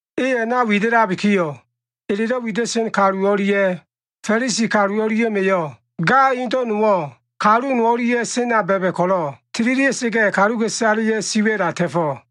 E a꞉na wida꞉labikiyo꞉, elelo꞉ wida꞉sen kalu o꞉lia꞉ Fa꞉lisi kalu o꞉lia꞉ma꞉yo꞉ ga indo꞉ nowo꞉, kalu no o꞉lia꞉ sena ba꞉ba꞉ ko꞉lo꞉ tililia꞉sa꞉ga꞉, kaluka꞉isaleya꞉ siwa꞉la ta꞉fo꞉.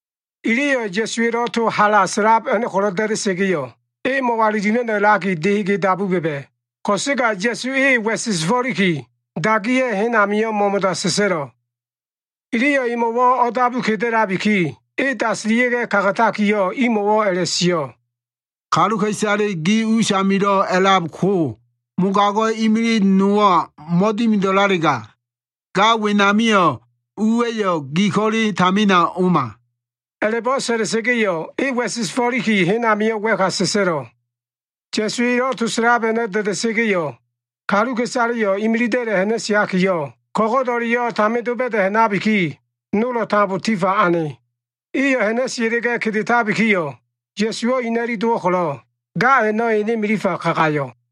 Iliyo꞉ Ya꞉suwa꞉lo꞉ to hala sa꞉lab a꞉no꞉ ko꞉lo꞉ da꞉da꞉sa꞉ga꞉yo꞉, e mo꞉walilima꞉no꞉ a꞉laki dehege dabu ba꞉ba꞉. Ko꞉sega Ya꞉su e wa꞉sesefo꞉liki, dagiya꞉yo꞉ hen ami mo꞉mo꞉da sa꞉sa꞉lo꞉. Iliyo꞉ emo꞉wo꞉ o꞉dabu kedelabiki, e dasilia꞉ga꞉ kagatakiyo꞉ imo꞉wo꞉ a꞉la꞉sio꞉, “Kaluka꞉isale gi usamilo꞉ a꞉lab ko mogago꞉ imilig nowo꞉ mo꞉dimido꞉lalega, ga wenamio꞉ uwa꞉yo꞉ gi ko꞉le tamina o꞉ma.” A꞉la꞉bo꞉ sa꞉la꞉sa꞉ga꞉yo꞉, e wa꞉sesefo꞉liki hen amio꞉ wa꞉ka sa꞉sa꞉lo꞉. Ya꞉su elo꞉ to sa꞉lab a꞉no꞉ da꞉da꞉sa꞉ga꞉yo꞉, kaluka꞉isaleyo꞉ imilida꞉la꞉ ha꞉na꞉siakiyo꞉, ko꞉go꞉do꞉leyo꞉ tamin doba꞉da꞉ ha꞉nabiki, nolo꞉ tambo tifa ane. Iyo꞉ ha꞉na꞉sia꞉la꞉ga꞉ kedetabikiyo꞉, Ya꞉suwo꞉ ina꞉li dowo꞉ ko꞉lo꞉ ga a꞉no꞉ ene milifa kagayo꞉.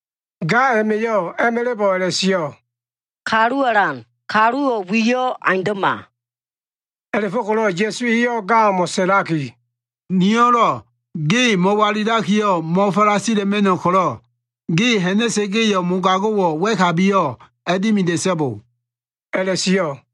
Ga a꞉ma꞉yo꞉ a꞉ma꞉la꞉bo꞉ a꞉la꞉sio꞉, “Kalu alan, kaluwo꞉ wiyo꞉ aundo꞉ma.” A꞉la꞉fo꞉ko꞉lo꞉ Ya꞉su eyo꞉ gamo꞉ sa꞉laki, “Niyo꞉lo꞉ ge mo꞉walilakiyo꞉, mo꞉falasila꞉ma꞉no꞉ ko꞉lo꞉, ge ha꞉na꞉sa꞉ga꞉yo꞉, mogago꞉wo꞉ wa꞉kabiyo꞉ a꞉dimida꞉so꞉bo” a꞉la꞉sio꞉.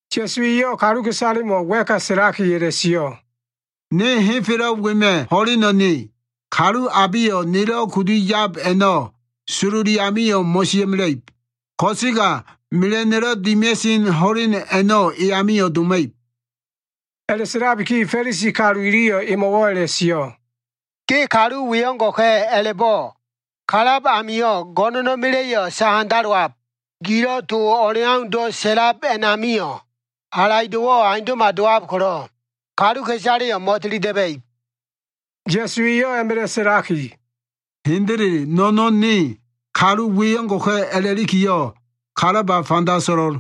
Ya꞉su eyo꞉ kaluka꞉isalemo꞉ wa꞉ka sa꞉laki a꞉la꞉sio꞉, “Ne henfelo꞉ wema꞉ ho꞉leno꞉ ne. Kalu abeyo꞉ nelo꞉ kudu yab a꞉no꞉ sololi amio꞉ mo꞉sia꞉mela꞉ib. Ko꞉sega mela꞉no꞉lo꞉ dimia꞉sen ho꞉len a꞉no꞉ e amio꞉ doma꞉ib.” A꞉la꞉sa꞉labiki Fa꞉lisi kalu iliyo꞉ emo꞉wo꞉ a꞉la꞉sio꞉, “Ge kalu we o꞉ngo꞉ka꞉ a꞉la꞉bo꞉ kalab amio꞉ go꞉no꞉na꞉ma꞉la꞉ sahandalowab. Gilo꞉ to o꞉leaundo꞉ sa꞉lab a꞉namio꞉ halaido꞉wo꞉ aundo꞉ma dowab ko꞉lo꞉, kaluka꞉isaleyo꞉ mo꞉tili da꞉ba꞉ib.” Ya꞉su eyo꞉ a꞉ma꞉la꞉ sa꞉laki, “Hendele no꞉no꞉n ne, kalu we o꞉ngo꞉ka꞉ a꞉la꞉likiyo꞉ kalaba fanda so꞉lo꞉l.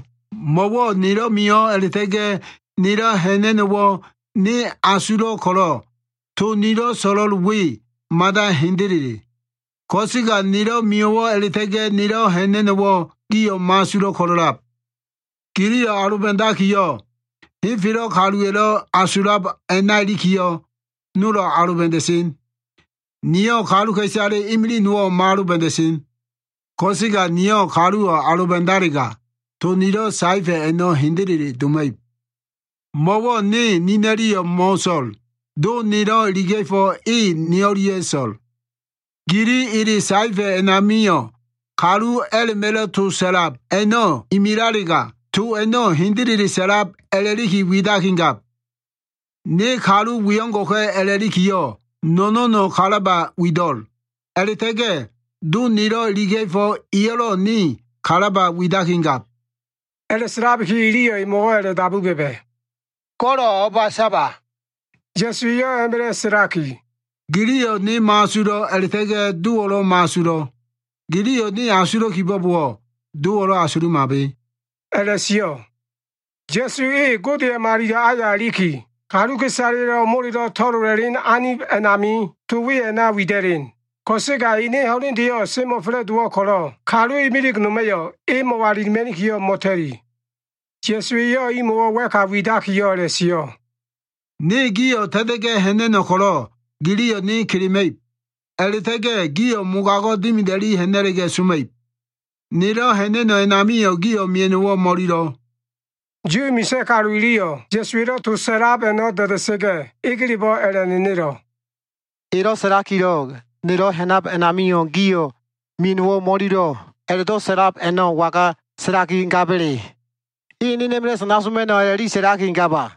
Mo꞉wo꞉ nelo꞉ mio꞉wo꞉ a꞉la꞉ta꞉ga꞉ nelo꞉ ha꞉na꞉no꞉wo꞉ ne asulo꞉ ko꞉lo꞉, to nilo꞉ so꞉lo꞉l we mada hendele. Ko꞉sega nelo꞉ mio꞉wo꞉ a꞉la꞉ta꞉ga꞉ nelo꞉ ha꞉na꞉no꞉wo꞉ gio꞉ mo꞉asulo꞉ ko꞉lo꞉lab. Giliyo꞉ aloba꞉dakiyo꞉, henfelo꞉ kaluwa꞉lo꞉ asulab a꞉na ilikiyo꞉, nolo꞉ aloba꞉da꞉sen. Niyo꞉ kaluka꞉isale imilig nowo꞉ mo꞉aloba꞉da꞉sen. Ko꞉sega niyo꞉ kaluwo꞉ aloba꞉dalega, to nilo꞉ saefa꞉ a꞉no꞉ hendele doma꞉ib. Mo꞉wo꞉ ne nina꞉liyo꞉ mo꞉so꞉l. Do nelo꞉ iliga꞉fo꞉ e ne o꞉lia꞉ so꞉l. Gili ele saefa꞉ a꞉namio꞉, kalu a꞉la꞉ma꞉lo꞉ to sa꞉lab a꞉no꞉ imilalega, to a꞉no꞉ hendele sa꞉lab a꞉la꞉liki widakigab. Ne kalu we o꞉ngo꞉ka꞉ a꞉lakiyo꞉ no꞉no꞉no꞉ kalaba wido꞉l. A꞉la꞉ta꞉ga꞉ Do nelo꞉ iliga꞉fo꞉ eyo꞉lo꞉ ne kalaba widakigab.” A꞉la꞉sa꞉labiki, iliyo꞉ emo꞉wo꞉ a꞉la꞉dabu ba꞉ba꞉, “Go꞉lo꞉ o꞉ba saba?” Ya꞉su eyo꞉ a꞉ma꞉la꞉ sa꞉laki, “Giliyo꞉ ne mo꞉asulo꞉ a꞉la꞉ta꞉ga꞉ Dowo꞉lo꞉ mo꞉asulo꞉. Giliyo꞉ ne asulo꞉ kibo꞉bowo꞉, Dowo꞉lo꞉ asulumabe” a꞉la꞉sio꞉. Ya꞉su e Godeya꞉ malilo꞉ aya iliki, kaluka꞉isaleya꞉lo꞉ molelo꞉ to꞉lola꞉sen anib a꞉namio꞉, to we a꞉na wida꞉len. Ko꞉sega ene ho꞉lendeyo꞉ semo꞉fa꞉la꞉dowo꞉ ko꞉lo꞉, kalu imilig noma꞉yo꞉ e mo꞉walilima꞉nikiyo꞉ mo꞉ta꞉li. Ya꞉su eyo꞉ imo꞉wo꞉ wa꞉ka widakiyo꞉ a꞉la꞉sio꞉, “Ne gio꞉ ta꞉ta꞉ga꞉ ha꞉na꞉no꞉ ko꞉lo꞉ giliyo꞉ ne kelema꞉ib. A꞉la꞉ta꞉ga꞉ gio꞉ mogago꞉ dimida꞉li ha꞉na꞉la꞉ga꞉ soma꞉ib. Nelo꞉ ha꞉na꞉no꞉ a꞉namio꞉, gio꞉ mia꞉no꞉wo꞉ mo꞉lilo꞉.” Yu misa꞉ kalu iliyo꞉ Ya꞉suwa꞉lo꞉ to sa꞉lab a꞉no꞉ da꞉da꞉sa꞉ga꞉ egelebo꞉ a꞉la꞉nenelo꞉, “Elo꞉ sa꞉lakilo꞉, ‘nelo꞉ ha꞉nab amio꞉ gio꞉ mia꞉no꞉wo꞉ mo꞉ililo꞉’ a꞉la꞉do꞉ sa꞉lab a꞉no꞉ waga sa꞉lakigaba꞉le? E enena꞉ma꞉la꞉ sana soma꞉no꞉ a꞉la꞉li sa꞉lakigaba?”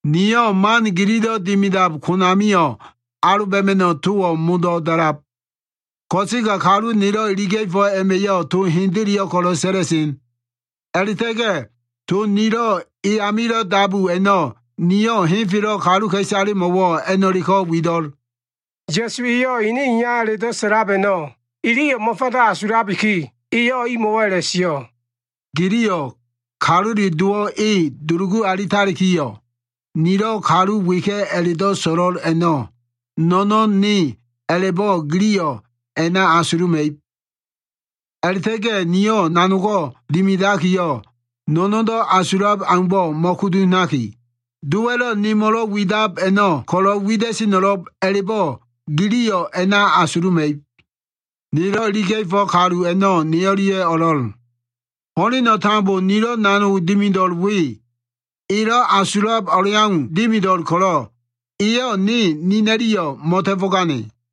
Niyo꞉ man gililo꞉ dimidab konamio꞉ aloba꞉ma꞉no꞉ towo꞉ modo꞉ da꞉lab. Ko꞉sega kalu nelo꞉ iliga꞉fo꞉ a꞉ma꞉yo꞉ to hendeleyo꞉ ko꞉lo꞉ sa꞉la꞉sen. A꞉la꞉ta꞉ga꞉ to nilo꞉ e amilo꞉ dabu a꞉no꞉ niyo꞉ henfelo꞉ kaluka꞉isalemo꞉wo꞉ a꞉no꞉leko꞉ wido꞉l.” Ya꞉su eyo꞉ ene Iya a꞉la꞉do꞉ sa꞉lab a꞉no꞉ iliyo꞉ mo꞉fanda asulabiki, eyo꞉ imo꞉wo꞉ a꞉la꞉sio꞉, “Giliyo꞉ Kalule Dowo꞉ e dulugu alitalikiyo꞉, nilo꞉ Kalu weka꞉ a꞉la꞉do꞉ so꞉lo꞉l a꞉no꞉ no꞉no꞉n ne a꞉la꞉bo꞉ giliyo꞉ a꞉na asuluma꞉ib. A꞉la꞉ta꞉ga꞉ niyo꞉ nanogo꞉ dimidakiyo꞉, no꞉no꞉ndo꞉ asulab aumbo꞉ mo꞉kudu ha꞉naki, Dowa꞉lo꞉ nemo꞉lo꞉ widab a꞉no꞉ ko꞉lo꞉ wida꞉seno꞉lo꞉b a꞉la꞉bo꞉ giliyo꞉ a꞉na asuluma꞉ib. Nelo꞉ iliga꞉fo꞉ kalu a꞉no꞉ ne o꞉lia꞉ o꞉lo꞉l. Ho꞉leno꞉ tambo nilo꞉ nanog dimido꞉l we, elo꞉ asulab o꞉leau dimido꞉l ko꞉lo꞉, eyo꞉ ne nina꞉liyo꞉ mo꞉ta꞉fo꞉gane.”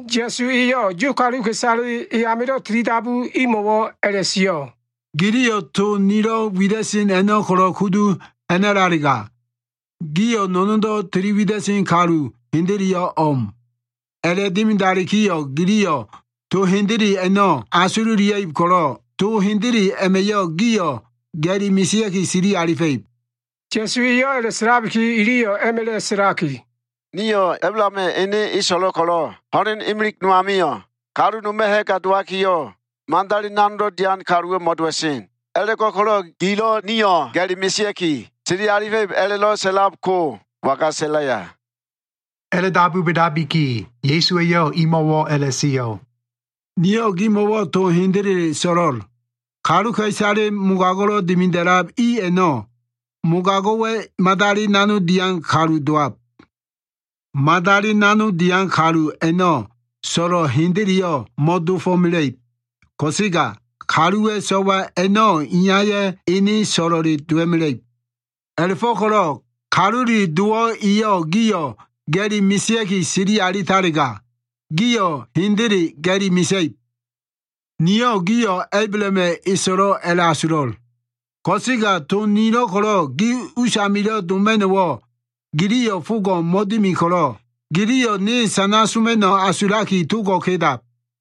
Ya꞉su eyo꞉ Yu kaluka꞉isale e amilo꞉ tilidabu i o꞉mo꞉wo꞉ a꞉la꞉sio꞉, “Giliyo꞉ to nilo꞉ wida꞉sen a꞉no꞉ ko꞉lo꞉ kudu ha꞉na꞉lalega, gio꞉ no꞉no꞉ndo꞉ tiliwida꞉sen kalu hendeleyo꞉ o꞉m. A꞉la꞉dimidalikiyo꞉ giliyo꞉ to hendele a꞉no꞉ asululia꞉ib ko꞉lo꞉, to hendele a꞉ma꞉yo꞉ gio꞉ ga꞉li mesea꞉ki sili alifa꞉ib.” Ya꞉su eyo꞉ a꞉la꞉sa꞉labiki, iliyo꞉ a꞉ma꞉la꞉ sa꞉laki, “Nio꞉ Ablahama꞉ ene eso꞉lo꞉ ko꞉lo꞉ ho꞉len imilig no amio꞉, kalu noma꞉ ha꞉ga dowakiyo꞉, madali nanogdo꞉ dian kaluwo꞉ mo꞉dowa꞉sen. A꞉la꞉go꞉ko꞉lo꞉ gilo꞉ nio꞉ ga꞉li mesea꞉ki, sili alifa꞉ib a꞉la꞉do꞉ sa꞉lab ko waga sa꞉laya?” A꞉la꞉dabu ba꞉dabiki, Ya꞉su eyo꞉ imo꞉wo꞉ a꞉la꞉sio꞉, “Niyo꞉ gimo꞉wo꞉ to hendele so꞉lo꞉l. Kaluka꞉isale mogago꞉lo꞉ dimida꞉lab i a꞉no꞉, mogago꞉wa꞉ madali nanog dian kalu dowab. Madali nanog dian kalu a꞉no꞉ so꞉lo꞉ hendeleyo꞉ mo꞉dofo꞉mela꞉ib. Ko꞉sega kaluwa꞉ so꞉wa a꞉no꞉ iyaya꞉ ene so꞉lo꞉le dowa꞉mela꞉ib. A꞉la꞉fo꞉ko꞉lo꞉ Kalule Dowo꞉ eyo꞉ gio꞉ ga꞉li mesea꞉ki sili alitalega, gio꞉ hendele ga꞉li mesa꞉ib. Niyo꞉ gio꞉ Ablahama꞉ eso꞉lo꞉ a꞉la꞉asulo꞉l. Ko꞉sega to nilo꞉ ko꞉lo꞉ gi usamilo꞉ doma꞉no꞉wo꞉ giliyo꞉ fogo꞉ mo꞉dimi ko꞉lo꞉, giliyo꞉ ne sana sa꞉ma꞉no꞉ asulaki togo꞉ kedab.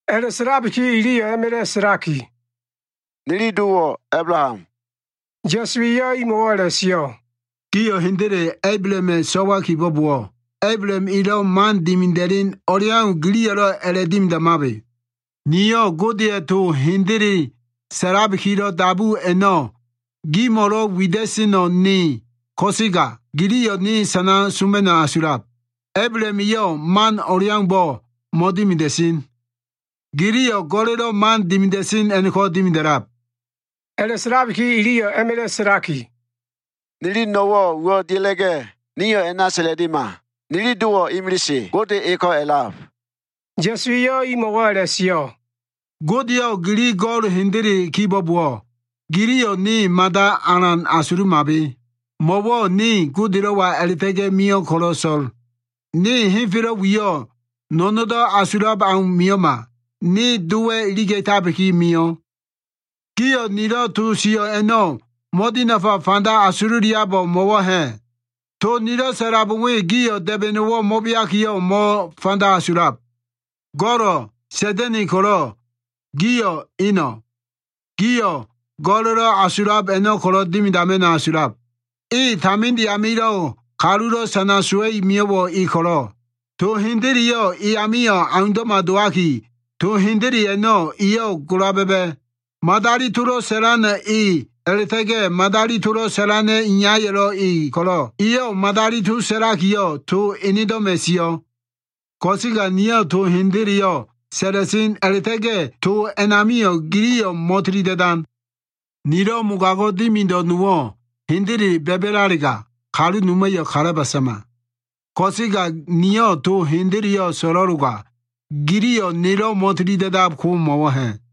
A꞉la꞉sa꞉labiki, iliyo꞉ a꞉ma꞉la꞉ sa꞉laki, “Nili dowo꞉ Ablaham.” Ya꞉su eyo꞉ imo꞉wo꞉ a꞉la꞉sio꞉, “Gio꞉ hendele Ablahama꞉ so꞉wa kibo꞉bowo꞉, Ablaham elo꞉ man dimida꞉len o꞉leau giliyo꞉lo꞉ a꞉la꞉dimidamabe. Niyo꞉ Godeya꞉ to hendele sa꞉labikilo꞉ dabu a꞉no꞉ gimo꞉lo꞉ wida꞉seno꞉ ne ko꞉sega, giliyo꞉ sana soma꞉no꞉ asulab. Ablaham eyo꞉ man o꞉leaumbo꞉ mo꞉dimida꞉sen. Giliyo꞉ go꞉la꞉lo꞉ dimida꞉sen man a꞉no꞉ko꞉ dimida꞉lab.” A꞉la꞉sa꞉labiki iliyo꞉ a꞉ma꞉la꞉ sa꞉laki, “Nili no꞉wo꞉ uwo꞉ dia꞉la꞉ga꞉ nio꞉ a꞉na sa꞉la꞉lima! Nili Dowo꞉ imilise, Gode eko꞉ a꞉lab.” Ya꞉su eyo꞉ imo꞉wo꞉ a꞉la꞉sio꞉, “Godeyo꞉ gili go꞉l hendele kibo꞉bowo꞉, giliyo꞉ ne mada alan asulumabe. Mo꞉wo꞉ ne Godelo꞉wa a꞉la꞉ta꞉ga꞉ mio꞉ ko꞉lo꞉ so꞉l. Ne henfelo꞉ wiyo꞉ no꞉no꞉ndo꞉ asulab au mio꞉ma. Ne Dowa꞉ iliga꞉tabiki mio꞉. “Gio꞉ to nilo꞉ sio꞉ a꞉no꞉ mo꞉dinafa fanda asululiabo꞉ mo꞉wo꞉ ha꞉? To nilo꞉ sa꞉lab we gio꞉ da꞉ba꞉no꞉wo꞉ mo꞉beakiyo꞉, mo꞉fanda asulab. Go꞉lo꞉ Sa꞉da꞉na꞉ ko꞉lo꞉ gio꞉ eno꞉. Gio꞉ go꞉la꞉lo꞉ asulab a꞉no꞉ ko꞉lo꞉ dimidama꞉no꞉ asulab. E taminde amilo꞉ kalulo꞉ sana sowa꞉i mio꞉wo꞉ e ko꞉lo꞉, to hendeleyo꞉ e amio꞉ aundo꞉ma dowaki, to hendele a꞉no꞉ eyo꞉ gola ba꞉ba꞉. Madali tolo꞉ sa꞉lano꞉ e a꞉la꞉ta꞉ga꞉ madali tolo꞉ sa꞉lana꞉ iyayo꞉lo꞉ e ko꞉lo꞉, eyo꞉ madali to sa꞉lakiyo꞉, to enedo꞉ma꞉ sio꞉. Ko꞉sega niyo꞉ to hendeleyo꞉ sa꞉la꞉sen, a꞉la꞉ta꞉ga꞉ to a꞉namio꞉ giliyo꞉ mo꞉tili da꞉dan. Nilo꞉ mogago꞉ dimido꞉ nowo꞉ hendele ba꞉ba꞉lalega, kalu noma꞉yo꞉ kalaba sama. Ko꞉sega niyo꞉ to hendeleyo꞉ so꞉lo꞉loga, giliyo꞉ nelo꞉ mo꞉tilida꞉dab ko mo꞉wo꞉ ha꞉?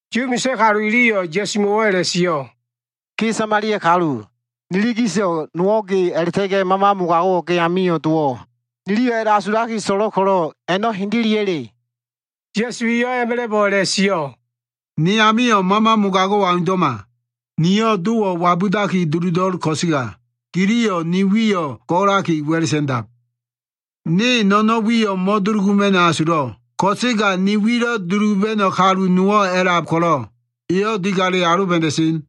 Yu misa꞉ kalu iliyo꞉ Ya꞉sumo꞉wo꞉ a꞉la꞉sio꞉, “Ge Samalia kalu, ni o꞉lia꞉lo꞉ gisdo꞉ dowabo꞉ ge a꞉la꞉ta꞉ga꞉ mama mogago꞉wo꞉ ge amio꞉ dowo꞉ niliyo꞉ a꞉la꞉asulaki so꞉lo꞉l ko꞉lo꞉ a꞉no꞉ hendeleya꞉le?” Ya꞉su eyo꞉ a꞉ma꞉la꞉bo꞉ a꞉la꞉sio꞉, “Ne amio꞉ mama mogago꞉wo꞉ aundo꞉ma. Niyo꞉ Dowo꞉ wabudaki duludo꞉l ko꞉sega giliyo꞉ ne wiyo꞉ golaki, wa꞉la꞉ sa꞉ndab. Ne no꞉no꞉n wiyo꞉ mo꞉duluguma꞉no꞉ asulo꞉l. Ko꞉sega ni wilo꞉ duluba꞉no꞉ kalu nowo꞉ a꞉lab ko꞉lo꞉, eyo꞉ digale aloba꞉da꞉sen.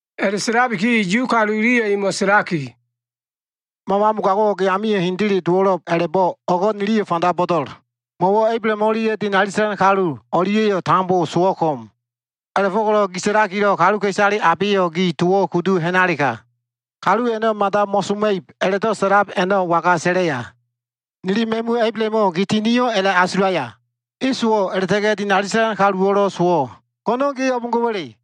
A꞉la꞉sa꞉labiki Yu kalu iliyo꞉ emo꞉ sa꞉laki, “Mama mogago꞉wo꞉ ge amio꞉ hendele dowo꞉lo꞉b a꞉la꞉bo꞉ o꞉go꞉ niliyo꞉ fanda bo꞉do꞉l. Mo꞉wo꞉ Ablaham o꞉lia꞉ dinali sa꞉lan kalu o꞉lia꞉yo꞉ tambo sowo꞉ ko꞉m. A꞉la꞉fo꞉ko꞉lo꞉ gi sa꞉lakilo꞉ kaluka꞉isale abeyo꞉ gi towo꞉ ko꞉lo꞉ kudu ha꞉nalega, kalu a꞉no꞉ mada mo꞉soma꞉ib a꞉la꞉do꞉ sa꞉lab a꞉no꞉ waga sa꞉laya? Nili ma꞉mu Ablahamo꞉ gi tinio꞉ a꞉la꞉asulaya? E sowo꞉, a꞉la꞉ta꞉ga꞉ dinali sa꞉lan kaluwo꞉lo꞉ sowo꞉. Go꞉no꞉n ge o꞉bo꞉ngo꞉wa꞉le?”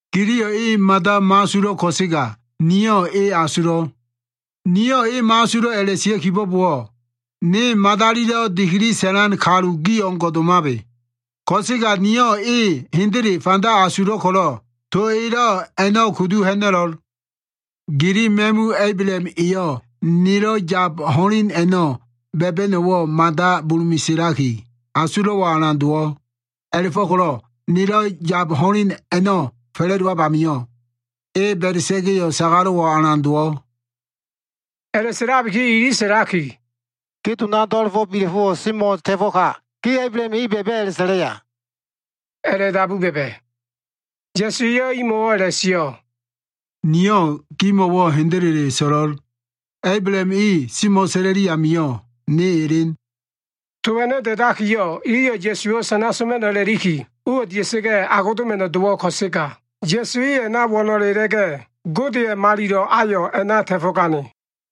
Giliyo꞉ e mada mo꞉asulo꞉ ko꞉sega, niyo꞉ e asulo꞉l. Niyo꞉ e mo꞉asulo꞉ a꞉la꞉sio꞉ kibo꞉bowo꞉, ne madalilo꞉ dikili sa꞉lan kalu gi o꞉ngo꞉ domabe. Ko꞉sega niyo꞉ e hendele fanda asulo꞉ ko꞉lo꞉, to elo꞉ a꞉no꞉ kudu ha꞉na꞉lo꞉l. Gili ma꞉mu Ablaham eyo꞉ nelo꞉ yab ho꞉len a꞉no꞉ ba꞉ba꞉no꞉wo꞉ mada bulu meselaki, asulo꞉wo꞉ alan dowo꞉. A꞉la꞉fo꞉ko꞉lo꞉ nelo꞉ yab ho꞉len a꞉no꞉ fa꞉la꞉dowab amio꞉, e ba꞉da꞉sa꞉ga꞉ sagalo꞉wo꞉ alan dowo꞉.” A꞉la꞉sa꞉labiki ili sa꞉laki, “Ge dona do꞉la꞉fo꞉ bila꞉fo꞉wo꞉ semo꞉ ta꞉fo꞉ka, ge Ablaham e ba꞉ba꞉ a꞉la꞉sa꞉laya?” a꞉la꞉dabu ba꞉ba꞉. Ya꞉su eyo꞉ imo꞉wo꞉ a꞉la꞉sio꞉, “Niyo꞉ gimo꞉wo꞉ hendele so꞉lo꞉l. Ablaham e semo꞉sa꞉la꞉li amio꞉ Ne Elen.” To a꞉no꞉ da꞉dakiyo꞉, iliyo꞉ Ya꞉suwo꞉ sana soma꞉no꞉ a꞉la꞉liki, uwo꞉ dia꞉sa꞉ga꞉ agodoma꞉no꞉ dowo꞉ ko꞉sega, Ya꞉su e a꞉na wo꞉no꞉le a꞉la꞉ga꞉, Godeya꞉ Malilo꞉ ayo꞉ a꞉na ta꞉fo꞉gane.